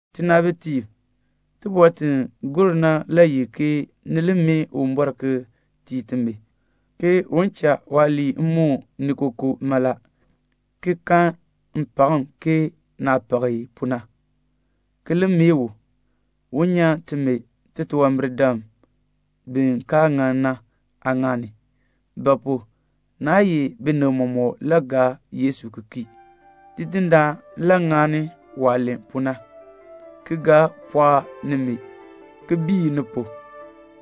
Tinaabitiib, tibɔr ti gur na le ye ke ni li mee Uwumbɔr ki tii timi, ke un cha waaliin moon ni kookoo mala, ki kan mpakm ke naah pak i pu na, ki li mee u, un nyan timi titunwambirdam bi kaa ŋan na aaŋaal ni; naa ye binib mɔmɔk le gaa Yesu ki kii. Tidindaan le ŋani waah len pu na, ki ga pɔɔk nimi, ki biin ni pu,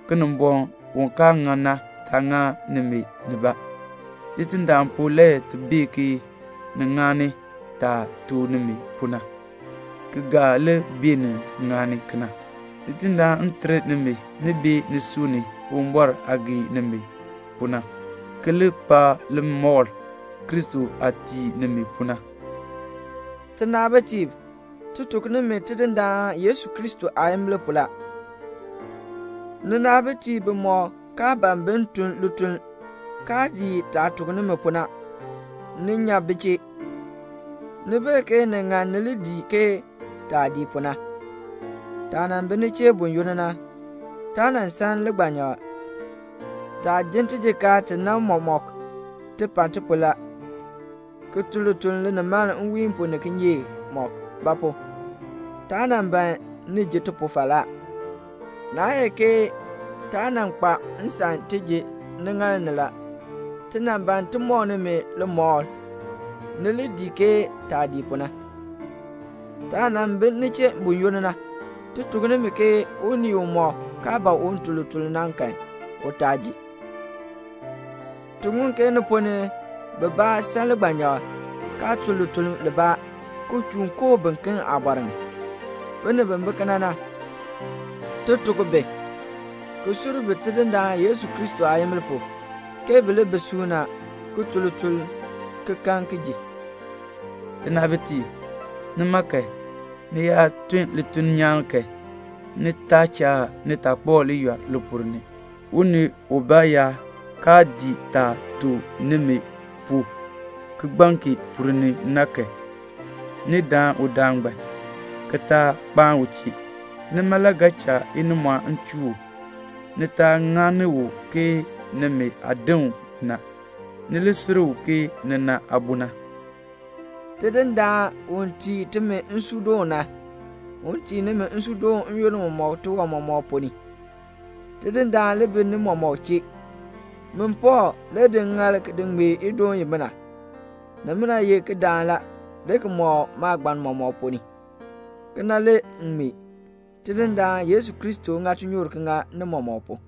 Kinimbɔŋ u kaa ŋan na taa ŋa nimi nibaa. Tidindaan pu le ti bee ke ni ŋani taah tuk nimi pu na, ki ga li beenin ŋani kena. Tidindaan ter nimi ni bee nisui ni Uwumbɔr aah gee nimi pu na, ki li kpa limɔr Kristo aah tii nimi pu na. Tinaabitiib, ti tuk nimi Tidindaan Yesu Kristo aayimbil pu la, ninaabitiib bimɔk kaa ban bin tun lituln, kaa dii taah tuk nimi pu na, ni nya bi chee. Ni bee ke ni ŋan ni li dii ke taah dii pu na. Taah nan bi ni chee buyoonn na, taa nan san ligbanyakl. Taah jin tijikaar ti na mɔmɔk, ti pa ti pu la, ki tun lituln linimaln nwiin pu ni kinyeek mɔk; ba pu? taa nan ban ni ji ti pu falaa. Naa ye ke taa nan kpa nsan ti ji niŋaal ni la. Ti nan ban ti mɔk nimi limɔkl, ni li dii ke taah dii pu na. Taah nan bi ni chee buyoonn na, ti tuk nimi ke unii umɔk kaa ban un tun lituln na kan, u taa ji. Ti ŋun ke ni ponn ni bibaa san ligbanyakl, kaa tun lituln libaa, ki chuun koo biken aabɔr ni. Binib bi bi kena na, ti tuk bi, ki sur bi Tidindaan Yesu Kristo aayimbil pu, ke bi li bi suuna, ki tun lituln ki kan ki ji. Tinaabitiib, nima kan, ni yaa tun lituln nyaan kan, ni taa cha nitaakpab yɔl li ponn ni. Unii ubaa yaa kaa dii taah tuk nimi pu kigbaŋ kee ponn ni na kan, ni daan udaan ngbaan, ki taa kpaan u chee. Nima le ga cha inimɔɔn chuu u. Ni taa ŋani u ke nimi aadin na, ni li sur u ke nina aabo na. Tidindaan u tii timi nsuudoon na, un tii nimi nsuudoon n-yoonn mɔmɔk tiwan mɔmɔk ponn ni. Tidindaan li bi ni mɔmɔk chee. Min Pɔɔl le di ŋŋaal ki ŋmee idoon imina. Nimina ye kidaan la, le ki mɔk maagbann mɔmɔk ponn ni. Kena le m ŋmee. Tidindaan Yesu Kristo ŋa tinyoor ki ŋa ni mɔmɔk pu.